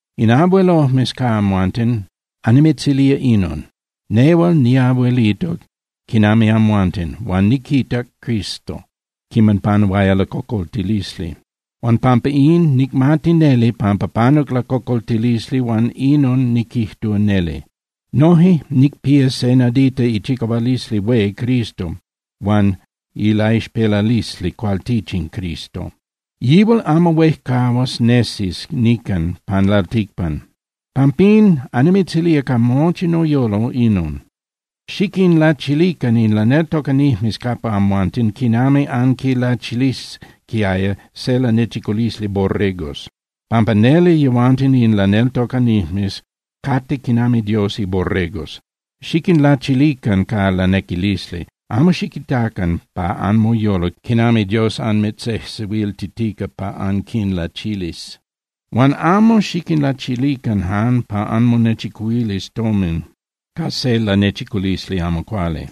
In abuelojmes ca amhuanten, annimitzilía inon: Nehual niabuelito quinami amhuanten, huan niquitac Cristo quiman panuaya lacocoltilisli. Huan pampa in, nicmati neli pampa panuc lacocoltilisli huan inon niquijtúa neli. Noje nicpía se nadita ichicahualisli hué Cristo huan ilaixpelalisli cualtichin Cristo. Yihual amo huejcahuas nesis nican pan lalticpan. Pampín, annimitzilía ca mochi noyolo inon: Xiquinlachilican in laneltocanijmes capa amhuanten quinami anquinlachilisquiaya se lanechiculisli borregos, pampa neli yehuanten in laneltocanijmes cate quinami Dios iborregos. Xiquinlachilican ca lanequilisli. Amo xiquitacan pa anmoyolo quinami Dios anmitzejsehuiltitica pa anquinlachilis. Huan amo xiquinlachilican jan pa anmonechicuhuilis tomin ca se lanechiculisli amo cuali.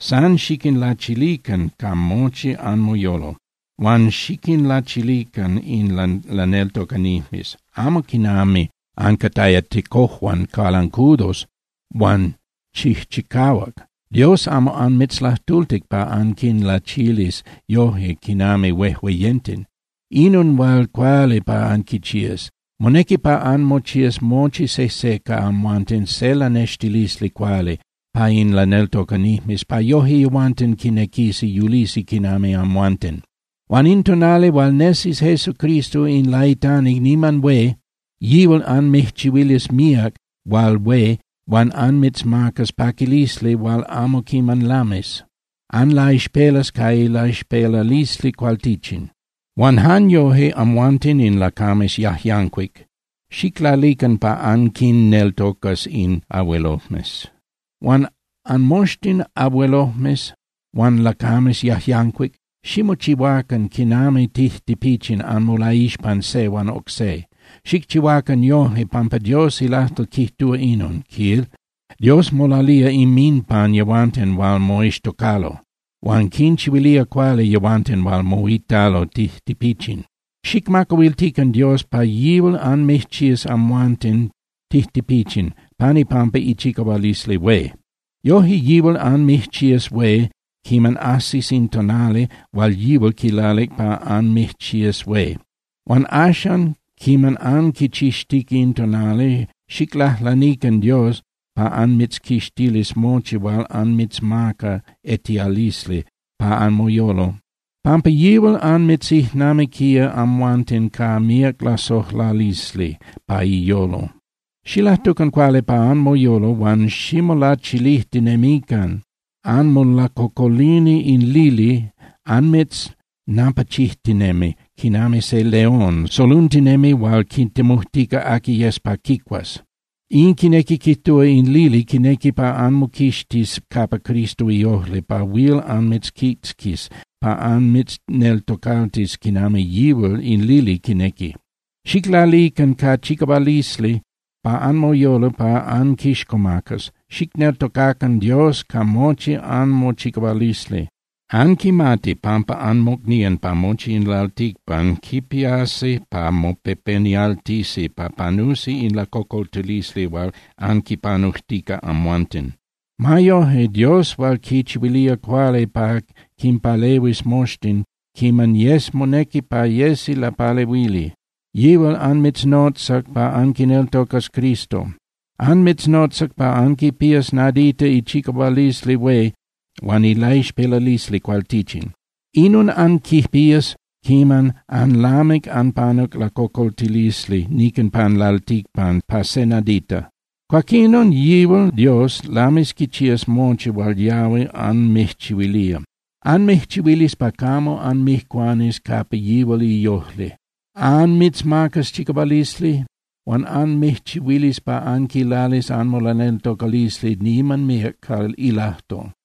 San xiquinlachilican ca mochi anmoyolo. Huan xiquinlachilican in laneltocanijmes, amo quinami ancataya tecojuan cualancudos huan chijchicahuac. Dios amo anmitzlajtultic pa anquinlachilis yoje quinami huejueyenten. Inon hual cuali pa anquichías: Monequi pa anmochías mochi sejse ca amhuanten se lanextilisli cuali pa in laneltocanijmes pa yoje yehuanten quinequisi yulisi quinami amhuanten. Huan in tonali hual nesis Jesucristo in laitani niman hué, yihual anmijchihuilis míac hual hué huan anmitzmacas paquilisli hual amo quiman lamis. Anlaixpelas ca ilaixpelalisli cualtichin. Huan jan yoje, amhuanten in lacames yajyancuic, xiclalican pa anquinneltocas in abuelojmes. Huan anmoxtin abuelojmes huan lacames yajyancuic, ximochihuacan quinami tijtipichin anmolaixpan se huan oc se. Xicchihuacan yojque pampa Dios ilajtol quijtúa inon, quil: Dios molalía inminpan yehuanten hual moixtocalo, huan quinchihuilía cuali yehuanten hual moitalo tijtipichin. Xicmacahuiltican Dios pa yihual anmijchías amhuanten tijtipichin pan ipampa ichicahualisli hué. Yoje yihual anmijchías hué quiman ajsis in tonali hual yihual quilalic pa anmijchías hué. Huan axan quiman anquichixtica in tonali, xiclajlanican Dios pa anmitzquixtilis mochi hual anmitzmaca etialisli pa anmoyolo, pampa yihual anmitzijnamiquía amhuanten ca míac lasojlalisli pa iyolo. Xilajtucan cuali pa anmoyolo huan ximolachilijtinemican. Anmolacocolini in lili anmitznapachijtinemi quinami se león soluntinemi hual quitemujtica aqui yes pa quicuas. In quinequi quijtúa in lili quinequi pa anmoquixtis capa Cristo iojli pa huil anmitzquitzquis pa anmitzneltocaltis quinami yihual in lili quinequi. Xiclalican ca chicahualisli pa anmoyolo pa anquixcomacas, xicneltocacan Dios ca mochi anmochicahualisli. Anquimati pampa anmocnían pa mochi in lalticpan quipiasi pa mopepenialtisi pa panusi in lacocoltilisli hual anquipanujtica amhuanten. Ma yoje, Dios hual quichihuilía cuali pa quinpalehuis moxtin quiman yes monequi pa yesi lapalehuili, yihual anmitznotzac pa anquineltocas Cristo. Anmitznotzac pa anquipías nadita ichicahualisli hué huan ilaixpelalisli cualtichin. Inon anquipías quiman anlamic anpanuc lacocoltilisli nican pan lalticpan pa je nadita. Cuaquinon yihual Dios lamis quichías mochi hual yahui anmijchihuilía. Anmijchihuilis pa camo anmijcuanis capa yihual iojli. Anmitzmacas chicahualisli huan anmijchihuilis pa anquilalis anmolaneltocalisli niman míac ca ilajtol.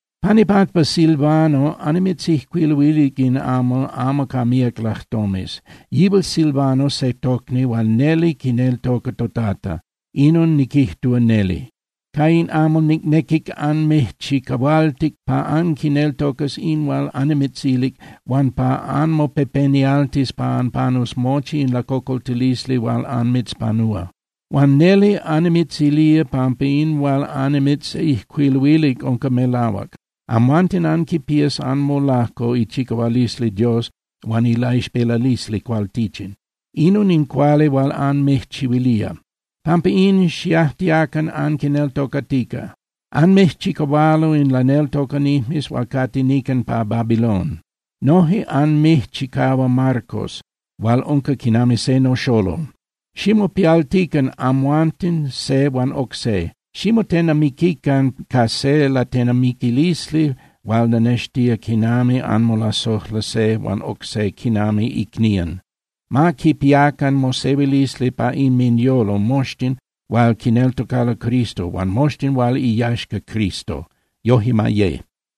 Pan ipampa Silvano annimitzijcuiluilic in amal amo ca míac lajtomes. Yihual Silvano se tocni hual neli quineltoca toTata, inon niquijtúa neli. Ca in amal nicnequic annimijchicahualtic pa anquineltocas in hual annimitzilic huan pa anmopepenialtis pa anpanus mochi in lacocoltilisli hual anmitzpanúa. Huan neli annimitzilía pampa in hual annimitzijcuiluilic unca melahuac, amhuanten anquipías anmolajco ichicahualisli Dios huan ilaixpelalisli cualtichin. Inon in cuali hual anmijchihuilía. Pampa in, xiajtiacan anquineltocatica. Anmijchicahualo in laneltocanijmes hual cate nican pa Babilón. Noje anmijchicahua Marcos hual unca quinami se noxolol. Ximopialtican amhuanten se huan oc se, ximotenamiquican ca se latenamiquilisli hual lanextía quinami anmolasojla se huan oc se quinami icnían. Ma quipiacan mosehuilisli pa inminyolo moxtin hual quineltocalo Cristo huan moxtin hual iyaxca Cristo. Yoje ma ye.